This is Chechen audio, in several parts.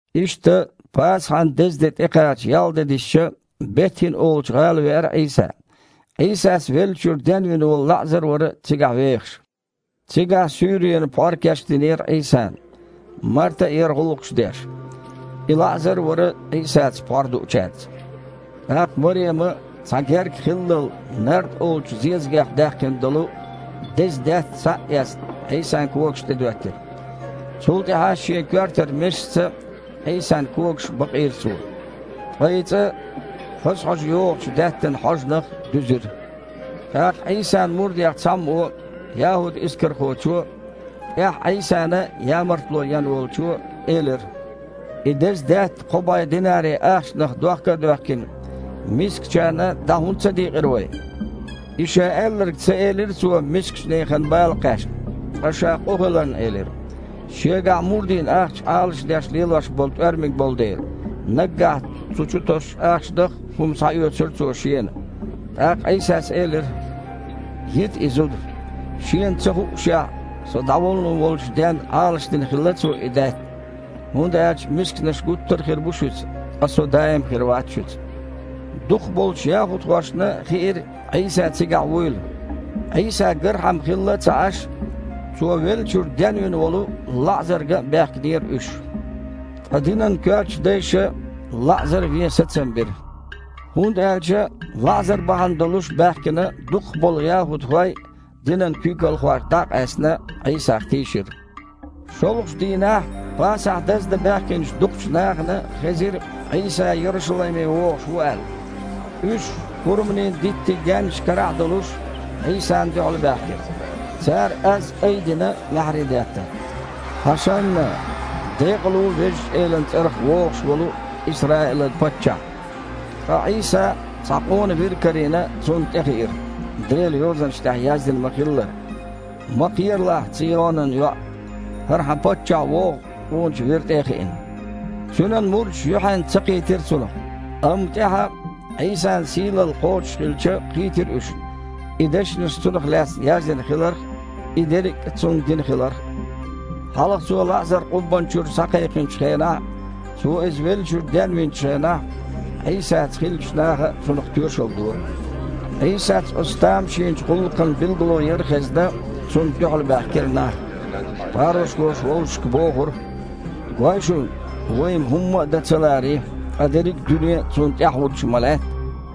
Иштта, Пасахьан деза де тІекхача ялх де дисича, Бет-ХІина олучу гІала веара Іийса. Іийсас веллачуьра денвина волу ЛаІзар а вара цигахь вехаш. Цигахь суьйренан пхьор кечдинера Іийсана. Марта а яра гІуллакхаш деш. И ЛаІзар а вара Іийсаца пхьор дуучаьрца. ТІаккха Марема, цхьа герка хиллал нард олучу зезагех даьккхина долу деза даьтта, схьа а эцна, Іийсан когаш тІе доьттира. Цул тІаьхьа шен коьртара месашца Іийсан когаш бакъийра цо. Ткъа и цІа хаза хьожа йогІучу даьттанан хьожанах дуьзира. ТІаккха Іийсан мурдех цхьаммо, ЯхІуд-Искархочо, тІаьхьа Іийсана ямартло ен волчо, элира: «И деза даьтта кхо бІе динари ахчанах дохка а доьхкина, мискачарна дІа хІунда ца дийкъира вай?» И ша аьлларг ца элира цо мискачу нехан бала кхаьчна, ткъа ша къу хиларна элира. Шегахь мурдийн ахча Іалашдеш лелош болу тІоьрмаг болу дела, наггахь цу чу тосучу ахчанах хІума схьаоьцура цо шена. ТІаккха Іийсас элира: «Йита и зуда. Шена ца хуъушехь, Со дІавуллун волчу денна Іалашдина хилла цо и даьтта. ХІунда аьлча мисканаш гуттар а хир бу шуьца, ткъа Со даим хир вац шуьца». Дукхах болчу яхІудхошна хиира Іийса цигахь вуйла. Іийса гархьама хилла а ца Іаш, Цо веллачуьра денвина волу ЛаІзар ган а баьхкинера уьш. Ткъа динан коьртачу дайша ЛаІзар а вен сацам бира. ХІунда аьлча ЛаІзар бахьана долуш баьхкина дукхах болу яхІудхой, динан куьйгалхойх дІа а къаьстина, Іийсах тийшира. ШолгІачу дийнахь Пасахь даздан баьхкинчу дукхачу нахана хезира, Іийса Ярушалайме вогІуш ву аьлла. Уьш, хурманийн диттийн гаьннаш карахь а долуш, Іийсана дуьхьалбаьхкира. Цара аз айдина маьхьарий деттара: «ХІашанна! Декъала ву Везачу Элан цІарах вогІуш волу Исраилан Паччахь!» Ткъа Іийса, цхьа къона вир карийна, цунна тІе хиира, Делан Йозанаш тІехь яздина ма-хиллара: «Ма кхералахь, Цийонан йоІ! ХІара хьан Паччахь вогІу, къоначу вира тІе а хиъна». Цуьнан мурдаш юьхьанца ца кхийтира цунах. Амма, тІаьхьа, Іийсан сийлалла кхочушхилча, кхийтира уьш, и дешнаш Цунах лаьцна яздина хиларх а, и дерриг а Цунна дина хиларх а. Хьалха Цо ЛаІзар къуббанна чуьра схьакхайкхинчу хенахь а, Цо иза веллачуьра денвинчу хенахь а Іийсаца хиллачу наха цунах тоьшалла дора. Іийсас оцу тамашийнчу гІуллакхан билгало яр хезна, Цунна дуьхьалбаьхкира нах. Парушхоша вовшашка бохура: «Гой шуна, вай-м хІумма а дан ца ларий? Ткъа дерриг дуьне а Цунна тІаьхьахІуттуш ма лаьтта!»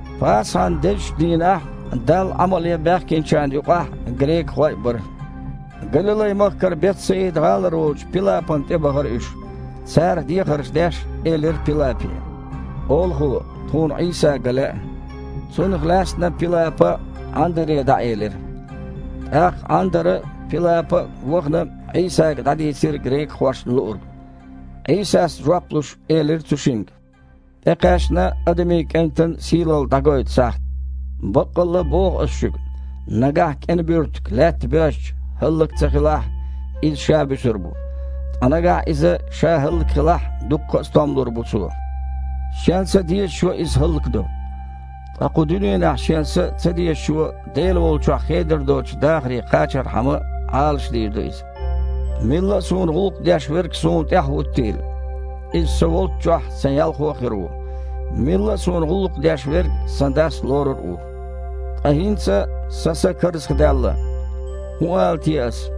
Пасахьан дезачу дийнахь Далла Іамал ян баьхкинчарна юкъахь грекахой а бара. Галилай-махкара Бет-Саида-гІалара волчу Пилапана тІебахара уьш. Цара, дехарш деш, элира Пилапе: «Олахо, тхуна Іийса ган лаьа». Цунах лаьцна Пилапа Іандаре дІаэлира. ТІаккха Іандара а, Пилапа а, вахана, Іийсага дІадийцира грекахошна луург. Іийсас, жоп луш, элира цу шинга: «ТІекхаьчна Адамийн КІентан сийлалла дІагойту сахьт. Баккъалла а боху Ас шуьга: нагахь кІен буьртиг лаьтта боьжча, хІаллак ца хилахь, иза ша буьсур бу. Ткъа нагахь иза ша хІаллакьхилахь а, дуккха а стом лур бу цо. Шен са дезачо иза хІаллакдо. Ткъа кху дуьненахь шен са ца дезачо, Дела волчохь хедар доцучу дахаре кхачархьама, Іалашдийр ду иза. Милла а Суна гІуллакх деш верг Суна тІаьхьахІуттийла. Иза Со волччохь Сан ялхо а хир ву. Милла а Суна гІуллакх деш верг Сан Дас лорур а ву». «Ткъа хІинца Сан са карзахдаьлла. ХІун ала те Ас?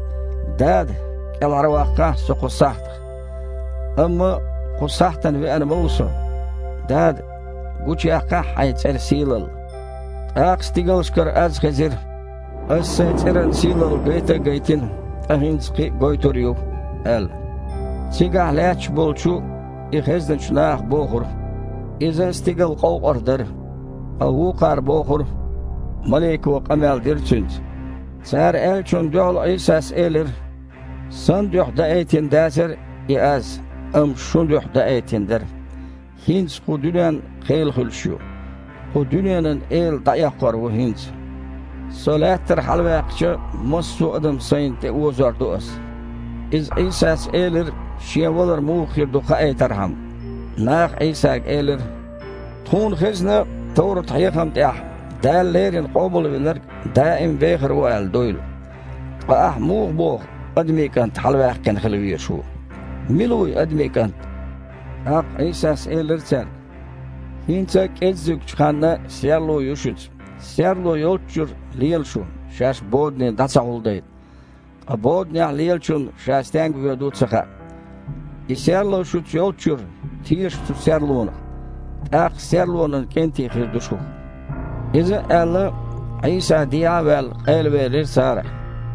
„Дада, кІелхьарваккхахьа Со кху сахьтах“? Амма кху сахьтана веана ма ву Со. Дада! Гучуяккхахьа Хьайн цІеран сийлалла!» ТІаккха стигалшкара аз хезира: «Ас Сайн цІеран сийлалла гайта а гайтина, ткъа хІинца кхин а гойтур а ю», – аьлла. Цигахь лаьтташ болчу, иза хезначу наха бохура: «Иза стигал къовкъар дара». Ткъа вукхара бохура: «Малико къамел дира Цуьнца». Цара аьллачунна дуьхьал Іийсас элира: «Сан дуьхьа даийтина дацара и аз, амма шун дуьхьа даийтина дара иза. ХІинца кху дуьненна кхел хуьлуш ю. Кху дуьненан эла дІаэккхор ву хІинца. Со лаьттара хьалаваьккхича, массо адам Сайна тІеозор ду Ас». Иза Іийсас элира, Шен валар муха хир ду хаийтархьама. Наха Іийсага элира: «Тхуна хезна товрат-хьехам тІехь, Дала леррина Къобалвинарг даим а вехар ву аьлла, дуйла. Ткъа Ахь муха боху: „Адамийн КІант хьалаваьккхина хила везаш ву? Мила ву и Адамийн КІант?“» ТІаккха Іийсас элира цаьрга: «ХІинца а кІеззигчу ханна серло ю шуьца. Серло йолччуьра, лела шу, шаьш бодане дІа ца хьулдайта. Ткъа боданехь лелачунна ша стенга воьду а ца хаьа. И серло шуьца йолччуьра, теша цу серлонах, тІаккха серлонан кІентий хир ду шух». Иза а аьлла, Іийса, дехьа а ваьлла, къайлавелира царах.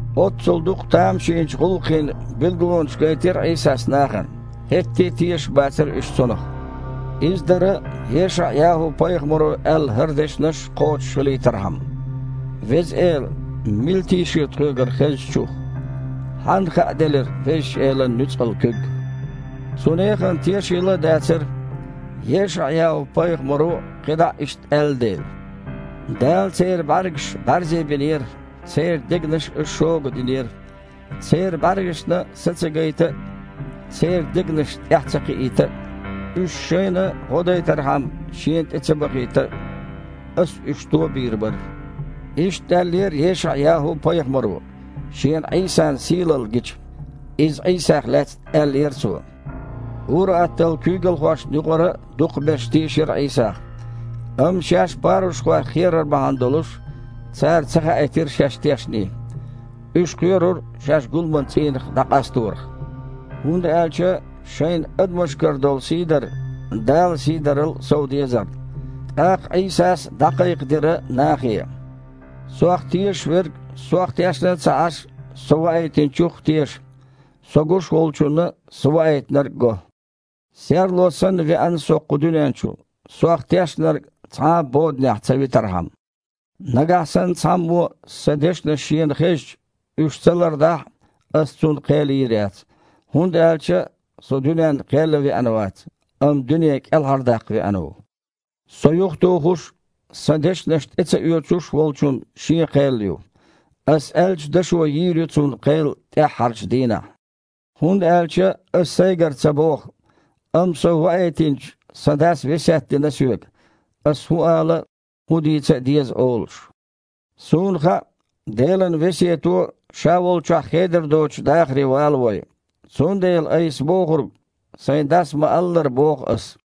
Оццул дукха тамашийнчу гІуллакхийн билгалонаш гайтира Іийсас нахана, хІетте а тешаш бацара уьш Цунах. Иза дара ЕшаІ-ЯхІу-пайхамаро аьлла хІара дешнаш кхочушхилийтархьама: «Веза Эла, мила тийшира тхоьгара хезначух? Хьанна хааделира Везачу Элан нуьцкъала куьг?» Цу нехан тешийла а дацара, ЕшаІ-ЯхІу-пайхамаро кхидІа а иштта аьлла дела: «Дала церан бІаьргаш бІаьрзе бинера, церан дегнаш а шога динера, церан бІаьргашна са ца гайта а, церан дегнаш тІаьхьа ца кхиийта а, уьш шайна гІо дайтархьама Шена тІе ца бахийта а. – Ас уьш то а бийр бара!» Иштта аьллера ЕшаІ-ЯхІу-пайхамаро, шена Іийсан сийлалла гича. Иза Іийсах лаьцна аьллера цо. Ур-атталла куьйгалхошна юкъара а дукхахберш тийшира Іийсах. Амма шаьш парушхойх кхерар бахьана долуш, цара ца хаийтира шаьш тешний. Уьш кхоьрура шаьш гуламан цІийнах дІакъасторах. ХІунда аьлча шайна адамашкара долу сийдар Дала сийдарал а сов дезарна. ТІаккха Іийсас дІакхайкхадира нахе: «Сох тешаш верг, Сох тешна а ца Іаш, Со Ваийтинчух а теша. Со гуш волчунна Со Ваийтинарг а го. Серло санна веана Со кху дуьнен чу, Сох тешнарг цхьа а боданехь ца витархьама. Нагахь санна цхьаммо Сан дешнаш шена хезча, уьш ца лардахь а, Ас цунна кхел йийр яц. ХІунда аьлча Со дуьненна кхел ян веана вац, амма дуьне кІелхьардаккха веана ву. Со юхатухуш а, Сан дешнаш тІе ца оьцуш а волчун шен кхел ю. Ас аьллачу дашо йийр ю цунна кхел тІаьххьарчу дийнахь. ХІунда аьлча Аса Сайгара ца боху, амма Со ваийтинчу Сан Дас весет дина Соьга, Аса хІун ала а, хІун дийца а деза олуш. Суна хаьа, Делан весето Ша волчохь хедар доцучу дахаре валавой. Цундела Айса бохург, Сайн Дас ма-аллара, боху Ас».